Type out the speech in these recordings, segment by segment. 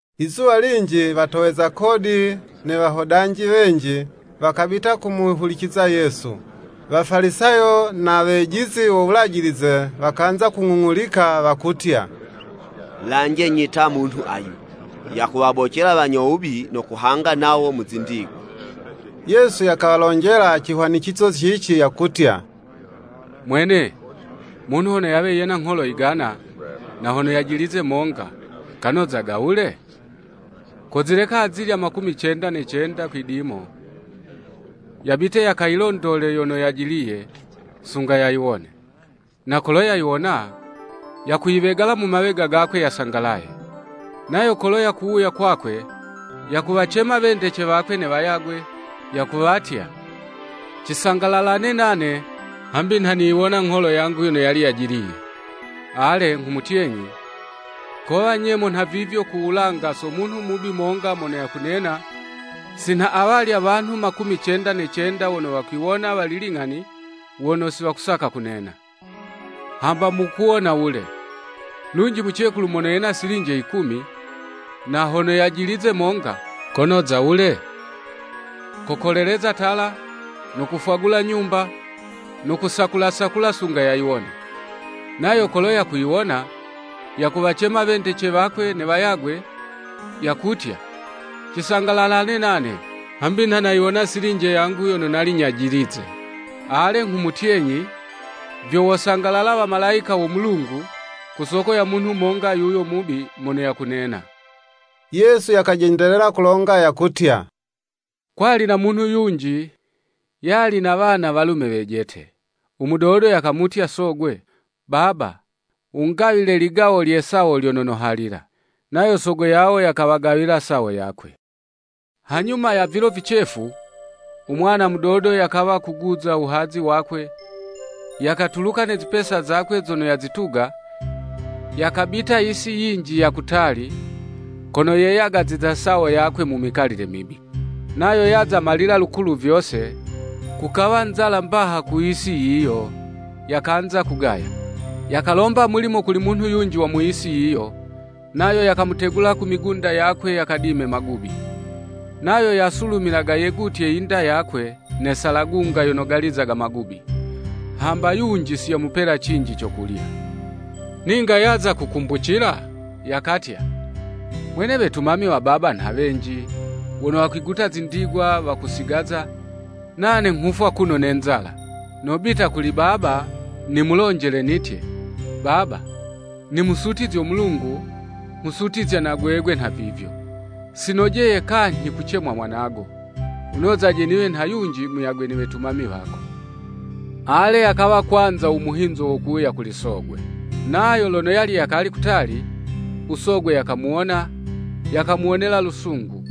Izuwa linji watoweza kodi ne wahodanji wenji, wakabita kumuhuliciza Yesu. Wafalisayo na wejizi wo Wulajilize, wakanza kung'ung'ulika wakutya, “Lanjenyi ta munhu ayu! Yakuwabocela wanyo wubi no kuhanga nawo mu zindigwa.” Yesu yakawalonjela cihwanicizo cici yakutya: “Mwene, munhu hono yawe yena ngholo yigana, na hono yajilize monga, kanozaga wule? Kozileka azilya makumi cenda ne cenda kwidimo, yabite yakayilondole yono yajiliye, sunga yayiwone. “Na kolo yayiwona, yakuyiwegala mu mawega gakwe yasangalaye. Nayo kolo yakuwuya kwakwe, yakuwacema wendece wakwe ne wayagwe, yakuwatya, ‘Cisangalalane nane, hambi nha niyiwona ngholo yangu yono yali yajiliye.’ Ale, nghumutyenyi, kowa nyemo nhavivyo ku wulanga so munhu mubi monga mono yakunena, si nha awalya wanhu makumi cenda ne cenda wono wakiwona wali ling'ani wono si wakusaka kunena. “Hamba mukuwona wule! Lunji mucekulu mono yena silinje yikumi, na hono yajilize monga, konoza wule? Kokoleleza tala, no kufwagula nyumba, no kusakula sakula sunga yayiwone. Nayo kolo yakuyiwona, yakuwacema wendece wakwe ne wayagwe, yakutya, ‘Cisangalalane nane, hambi nha nayiwona silinje yangu yono nali nyajilize.’ Ale, nghumutyenyi, vyo wosangalala wamalayika wo Mulungu, ku soko yo munhu monga munyo wubi mono yakunena.” Yesu yakajendelela kulonga yakutya, “Kwali na munhu yunji, yali na wana walume wejete. U mudodo yakamutya sogwe, ‘Baba wungawile ligawo lye sawo lyono nohalila.’ Nayo sogo yawo yakawagawila sawo yakwe. Hanyuma ya vilo vicefu, u mwana mudodo yakawa kuguza u wuhazi wakwe, yakatuluka ne zipesa zakwe zono yazituga, yakabita yisi yinji ya kutali, kono yeyagaziza sawo yakwe mu mikalile mibi. Nayo yaza malila lukulu vyose, kukawa nzala mbaha ku yisi yiyo, yakanza kugaya. Yakalomba mulimo kuli munhu yunji wa mu yisi yiyo, nayo yakamutegula ku migunda yakwe yakadime magubi. Nayo yasulumilaga yegutye yinda yakwe ne salagunga yono galizaga magubi; hamba yunji si yamupela cinji co kulya. Ninga yaza kukumbucila, yakatya, ‘Mwene, wetumami wa baba nha wenji, wono wakwiguta zindigwa wakusigaza, nane nghufwa kuno ne nzala! Nobita kuli baba, nimulonjele, nitye, Baba, nimusutizyo Mulungu, nghusutizya na gwegwe nhavivyo. Si nojeye kanyhi kucemwa mwanago. Wunozaje niwe nha yunji muyagwe ne wetumami wako.’ Ale, yakawa kwanza u muhinzo wo kuwuya kuli sogwe. Nayo lono yali yakali kutali, u sogwe yakamuwona, yakamuwonela lusungu,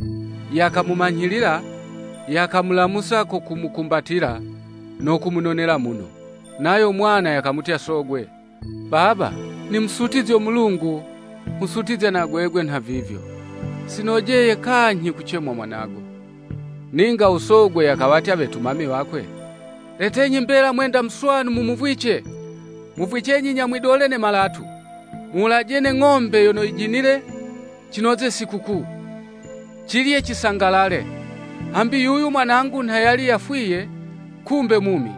yakamumanyhilila, yakamulamusa ko kumukumbatila, no kumunonela muno. Nayo mwana yakamutya sogwe, ‘Baba, nimusutizyo Mulungu, nghusutizya na gwegwe nhavivyo. Sinojeye kanyhi kucemwa mwanago.’ Ninga usogwe yakawatya wetumami wakwe. ‘Letenyi mbela mwenda muswanu mumuvwice; muvwicenyi nyamwidole ne malatu. Muwulaje ne ng'ombe yono yijinile cinoze sikukuu, cilye, cisangalale. Hambi yuyu mwanangu nha yali nha yafwiye, kumbe mumi,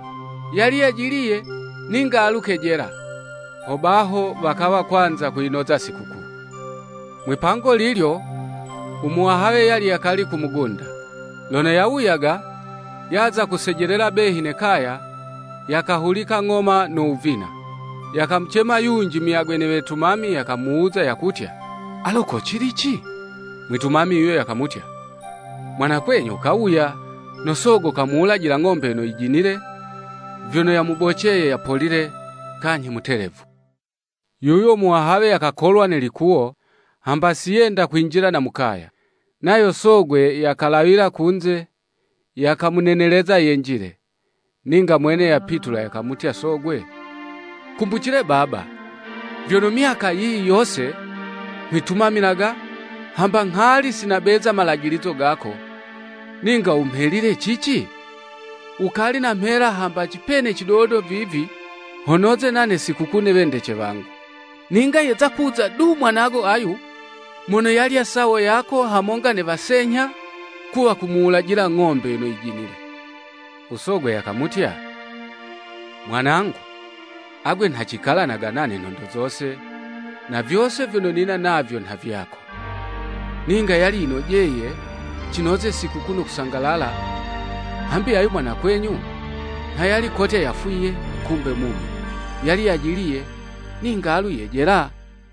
yali yajiliye, ninga alu kejela.’ Hobaho wakawa kwanza kuyinoza sikukuu. “Mwipango lilyo, u muwahawe yali yakali ku mugunda. Lono yawuyaga, yaza kusejelela behi ne kaya, yakahulika ng'oma no wuvina. Yakamucema yunji muyagwe ne wetumami, yakamuwuza yakutya, ‘Alo ko cilici?’ Mwitumami yuyo yakamutya, ‘Mwanakwenyu kawuya, no sogo kamuwulajila ng'ombe yono yijinile, vyono yamuboceye yapolile, kanyhi mutelevu.’ “Yuyo muwahawe yakakolwa ne likuwo, hamba si yenda kwinjila na mu kaya. Nayo sogwe yakalawila kunze, yakamuneneleza yenjile. Ninga mwene yapitula yakamutya sogwe, ‘Kumbucile baba, vyono myaka yiyi yose nghwitumamilaga, hamba nghali si nabeza malajilizo gako, ninga wumhelile cici? Wukali namhela hamba cipene cidodo vivi, ho noze nane sikukuu ne wendece wangu. Ninga yeza kuza du mwanago ayu, mono yalya sawo yako hamonga ne wasenyha, kuwa kumuwulajila ng'ombe yono yijinile.’ U sogwe yakamutya, ‘Mwanangu, agwe nha cikalanaga nane nhondo zose, na vyose vyono nina navyo nha vyako. Ninga yali yicinojeye cinoze sikukuu no kusangalala; hambi ayu mwanakwenyu, nha yali kotya yafwiye, kumbe mumi; yali yajiliye ninga alu yejela.'"